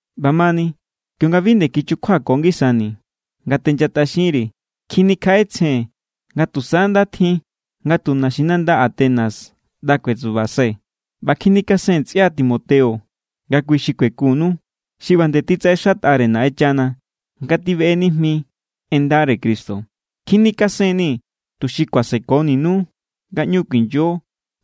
ꞌBamani, kionga bi nde kichukjuako ngisani̱ nga tenchatꞌaxinri̱, kjinikjaꞌetsjee̱n nga tusa nda tjin nga tu naxinanda Atenas ꞌnda kuetsubasubai̱ ꞌba kjinikasen ntsꞌia Timoteo nga kui xi kuekunnu. Xi ꞌba nde titsaꞌexatꞌare Naꞌenchana nga tibeꞌe nijmi en ndare Cristo. Kjinikasen=nii̱ tuxi kuasekoninu nga ꞌñu kuinyo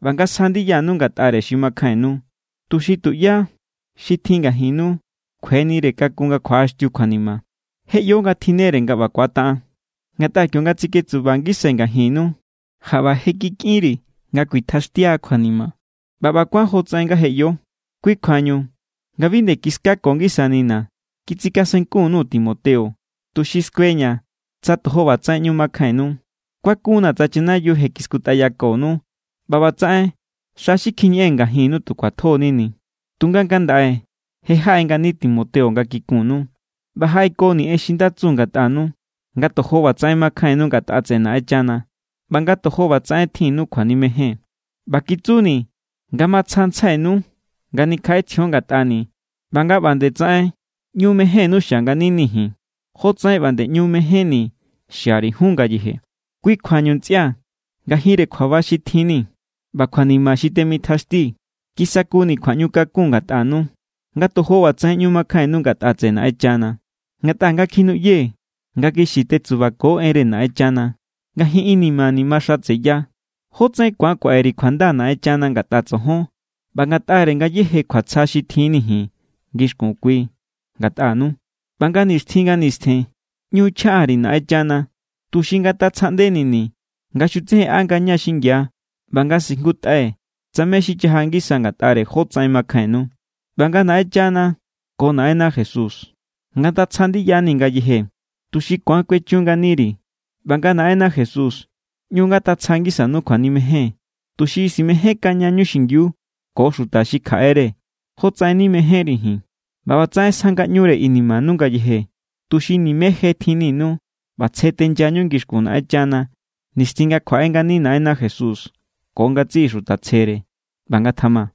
ꞌba nga sja ndiyanu ngatꞌare xi makjainnu, tuxi tuꞌyá xi tjin ngajinnu kjuenire kakun nga kjuaꞌaxtiu kjuanima. Je ꞌyo nga tjinnere nga ꞌba ku̱ataꞌan. Ngatꞌa kionga tsiketsuba ngisai̱ ngajinnu, jaꞌba je kikꞌinri̱ nga kuitjaxtia kjuanima, ꞌba ꞌba= kuán jotsaꞌen nga je ꞌyo. Kui= kjuañu, nga bi nde kiskako ngisanina̱, kitsikasenkun_nuu̱ Timoteo, tuxi skueña̱ tsa tojo ꞌbatsaꞌen ꞌñu makjainnu. Kuakun=na̱ tsa chanayiu je kiskutꞌayakonu ꞌba ꞌbatsaꞌen xa xi kjiñeꞌee̱n ngajinnu tu kjuatjo=nini. Tunga ngandaꞌe je jaꞌe ngani Timoteo nga kikunnu. ꞌBa jaꞌekoni̱ en xi nda tsu ngatꞌanu, nga tojo ꞌbatsaꞌen makjainnu ngatꞌa tseꞌe Naꞌenchana ꞌba nga tojo ꞌbatsaꞌen tjinnu kjuanimejen. ꞌBa kitsuni̱ nga matsjantsjainu nga nikjaꞌetsjion ngatꞌani̱ ꞌba nga ꞌba nde tsaꞌen ꞌñu mejénnu xia nganinii̱ ji̱n, jotsaꞌen ꞌba nde ꞌñu mejénni̱ xiari̱ jun ngayeje. Kui kjuañu ntsꞌia̱, ngajinre kjuaba xi tjin=ni̱ ꞌba kjuanima xi temitjaxtii̱, kisakuni̱ kjuaꞌñukakun ngatꞌanu, nga tojo ꞌbatsaꞌen ꞌñu makjainnu ngatꞌa tseꞌe Naꞌenchana. Ngatꞌa nga kjinuꞌyee̱ nga kixi tetsubako enre Naꞌenna, ngajin inimani̱ maxatseya. ¿Jótsaꞌen ku̱an kuaꞌe_ri̱ kjuanda Naꞌenchana ngatꞌa tsojon ꞌba ngatꞌare ngayéje kjuatsja xi tjinni̱ ji̱n ngixkun kui ngatꞌanu? ꞌBa nga nixtjin nga nistjen ꞌñu chjaꞌa_ri̱ Naꞌenchana tuxi ngatatsjaꞌndenini̱ nga xutsejenꞌa ngaña xingia ꞌba nga sijngutꞌai̱ tsa mé= xi chaja ngisa ngatꞌare jótsaꞌen makjainnu. ꞌBa nga Naꞌenchana ko Naꞌenna Jesús ngatatsja ndiyani̱ ngayeje, tuxi ku̱an kuechun nganiri̱. ꞌBa nga Naꞌenna Jesús ꞌñu ngatatsja ngisanu kjuanimejen, tuxi simejénkañañu xingiu ko xuta xi kjaꞌere jotsaꞌen nimejénri̱ ji̱n. ꞌBa ꞌbatsaꞌen sja ngaꞌñure inimanu ngayeje, tuxi nimé je tjinninu ꞌba tsje tenyañu ngixkun Naꞌenchana nixtjin nga kjuaꞌe ngani Naꞌenna Jesús ko ngatsiꞌi xuta tsjere. ꞌBa ngatjama.